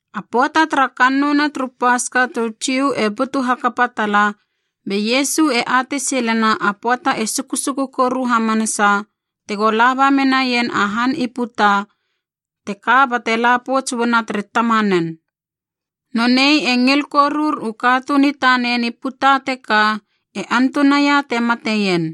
A pöata tara kannouna turu Paska turu Jiu e butu hakapa tala, be Iesu e atei silena a pöata e sukusuku koru hamanasa tego laba menaien a han i puta teka bate la pouts uana tere Tamanen. Nonei e ngil korur u katuun i tanen i puta teka e antunaia te mateien.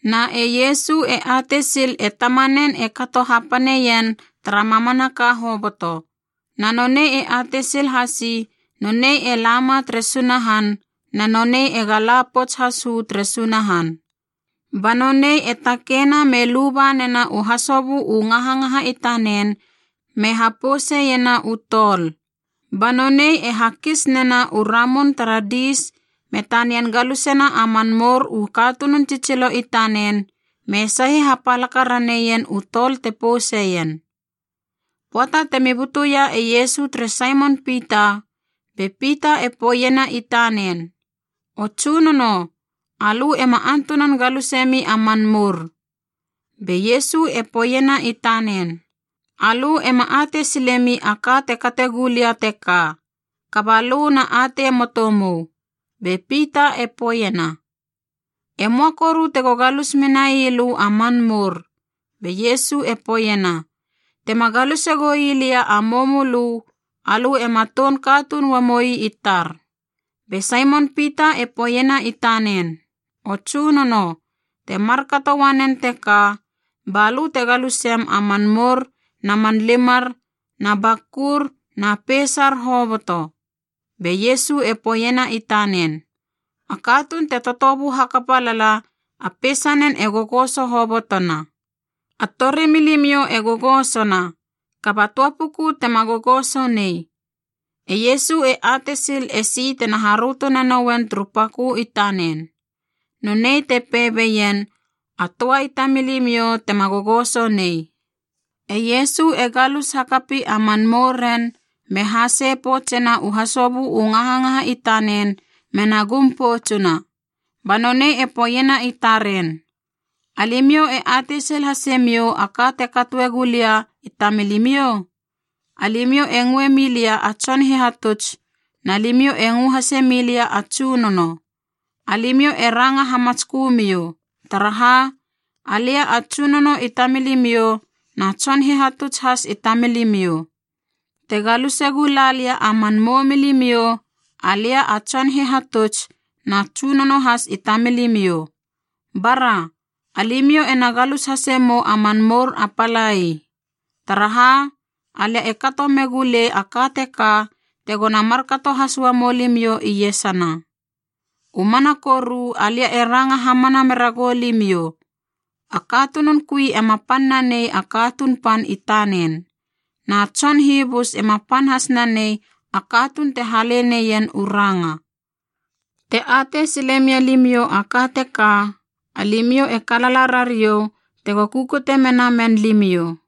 Na e Iesu e atei sil e Tamanen e kato hapaneien tara mamanaka hoboto, na nonei e atei sil hasi nonei e lama tere Sunahan na nonei ega la pouts has uu tere Sunahan. Ba nonei e takeina be luba nena u hasobö u ngahangaha i tanen me hapouseiena u tol. Ba nonei e hakis nena u ramun tara diis me tanian galusena a man mour u katunun tsitsilo i tanen me sahi hapalaka raneien u tol te pouseien. Pöata temi butuia e Iesu tere Saimon Pita, be Pita e poeiena i tanen, “O Tsunono, alö ema antunan galusemi a man mour!” Be Iesu e poeiena i tanen, “Alö ema atei silemi a ka te kate gulia teka, kaba lö na atei moto mou.” Be Pita e poeiena, “E möa koru tego galus menai lö a man mour!” Be Iesu e poeiena, “Tema galuse goi lia a moumölö, alö ema toun katuun uamoi i tar.” Be Saimon Pita e poeiena i tanen, “O Tsunono, te markato uanen teka, ba lö te galusem a man mour na man limar na bakur na peisar hoboto!” Be Iesu e poeiena i tanen, “A katuun te totobu hakapa lala, a peisanen e gogoso hobotona. A torimilimiou e gogosona, kaba töa puku tema gogoso nei.” E Iesu e atei sil esi tena haröto nanouen turu pakö i tanen. Nonei te pei beien, “A töa i tamilimiou tema gogoso nei.” E Iesu e galus hakapi a man mouren me hasei poutsena u hasobö u ngahangaha i tanen mena gum poutsuna. Ba nonei e poeiena i taren, “Alimiou e atei sil hasemiou a ka te katoe gula lia i tamilimiou? Alimiou e ngöe milia a Tson Hihatuts, na limiou e ngö hase milia a Tsunono. Alimiou e ranga hamatskömiou, taraha alia a Tsunono i tamilimiou na Tson Hihatuts has i tamilimiou. Te galuse gula lia a man moumilimiou—alia a Tson Hihatuts na Tsunono has i tamilimiou—bara, alimiou ena galus hasemou a man mour a palai. Taraha! Alia e kato megu lei a ka teka tegona markato has uamou limiou iesana. U mana koru alia e ranga hamana mera goulimiou, a katunun kui ema pan nanei a katuun pan i tanen. Na tson hibus ema pan has nanei a katuun te hale neien u ranga. Te atei silemia limiou a ka teka, alimiou e kalala rariou tego kukute nenamen limiou.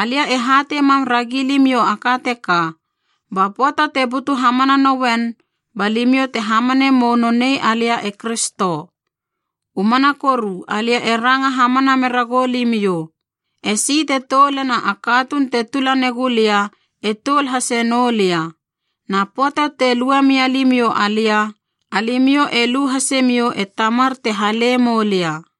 Alia e hatei mam ragi limiou a ka teka, ba pöata te butu hamana nouen ba limiou te hamane mou nonei alia e Kristo. U mana koru alia e ranga hamana mera goulimiou, esi te toulena a katuun te tula negulia e toul hase noulia. Na pöata te lue mia limiou alia, alimiou e lu hasemiou e Tamar te hale moulia.”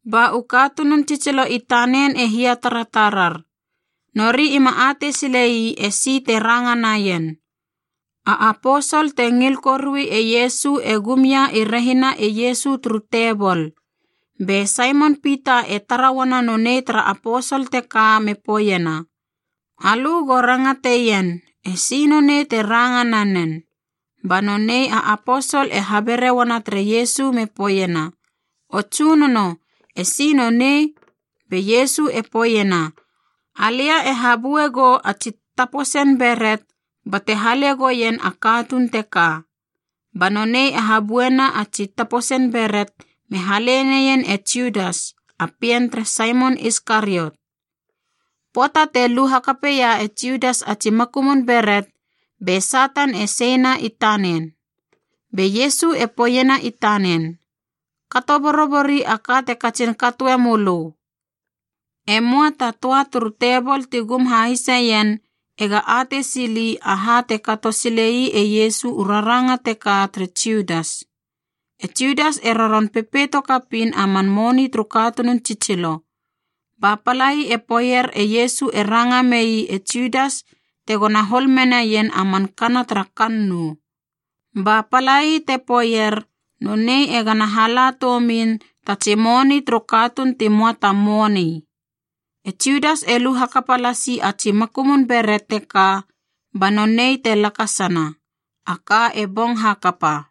Ba u katunun tsitsilo i tanen e hiataratarar. Nori ima atei silei esi te ranga naien. A aposol te ngil korui e Iesu e gum ia i rehina e Iesu turu tebol. Be Saimon Pita e tara uana nonei tara aposol teka me poeiena, “Alö go rangateien, esi nonei te ranga nanen.” Ba nonei a aposol e habere uana tere Iesu me poeiena, “O Tsunono, esi nonei?” Be Iesu e poeiena, “Alia e habue go a tsi taposen beret bate hale goien a katuun teka.” Ba nonei e habuena a tsi taposen beret me hale neien e Judas, a pien tere Saimon Iskariot. Pöata te lu hakapeia e Judas a tsi makumun beret, be Satan e seina i tanen. Be Iesu e poeiena i tanen, “Kato borobori a ka te katsin katoe mölö.” E möa ta töa turu tebol ti gum hahiseien ega atei sili aha te kato silei e Iesu u raranga teka tere Judas. E Judas e roron pepeito kapiin a man moni turu katunun tsitsilo, ba palai e poeier e Iesu e ranga mei e Judas tegona hol menaien a man kana tara kannou, ba palai te poeier nonei e gana hala toumin ta tsi moni turu katuun ti möa ta moni. E Judas e lu hakapa lasi a tsi makumun beret teka ba nonei te lakasana. A ka e bong hakapa.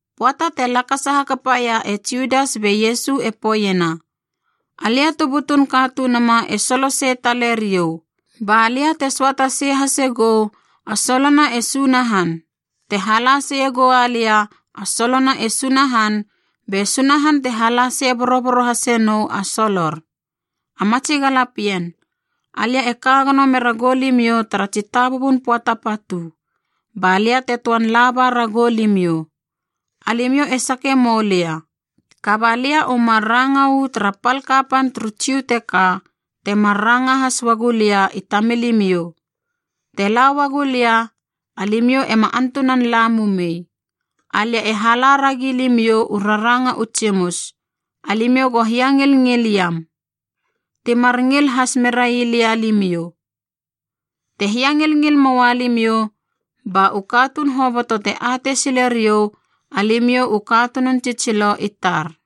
Pöata te lakasa hakapaia e Judas be Iesu e poeiena, “Alia tu butun Katunuma e solo sei tale riou. Ba lia te söata sei hasegou a solona e Sunahan. Te hala seie goua lia a solona e Sunahan be Sunahan te hala sei boroboro hase nou a solor. A matsi galapien, alia e ka gono mera goulimiou tara tsitabubun pöata patu, ba lia te töan laba ragou limiou. Alimiou e sakie moulia, kaba lia u mar ranga uu tara pal kapan turu Jiu teka, temar ranga has uagu lia i tamilimiou, ‘Te la uagu lia alimiou ema antunan la mumei.’ Alia e hala ragi limiou u raranga u tsimus, alimiou go hiangilngil iam. Ti mar ngil has merai lia limiou. Te hiangilngil moua limiou, ba u katuun hoboto te atei sile riou alimiou u katunun tsitsilo i tar.”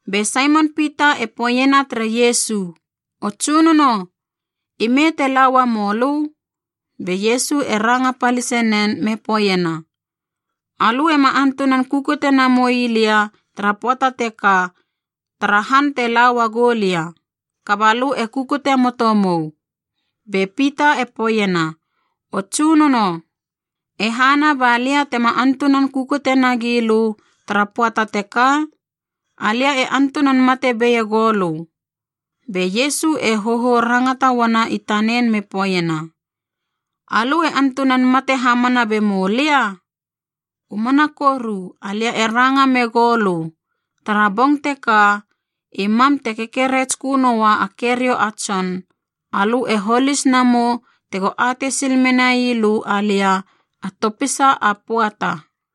Be Saimon Pita e poeiena tere Iesu, “O Tsunono, ime te la uamou lö?” Be Iesu e ranga palise nen me poeiena, “Alö ema antunan kukute namoi lia tara pöata teka tara han te la uagou lia, kaba lö e kukute moto mou.” Be Pita e poeiena, “O Tsunono, e hana ba lia tema antunan kukute nagi lö tara pöata teka? Alia e antunan mate beie goulö.” Be Iesu e hohou rangata uana i tanen me poeiena, “Alö e antunan mate hamana bemou lia? U mana koru alia e ranga megou lö, tara bong teka, i mam te kekeretskö noua a keriou a tson, alö e holis namou tego atei sil menai lö alia a topisa a pöata!”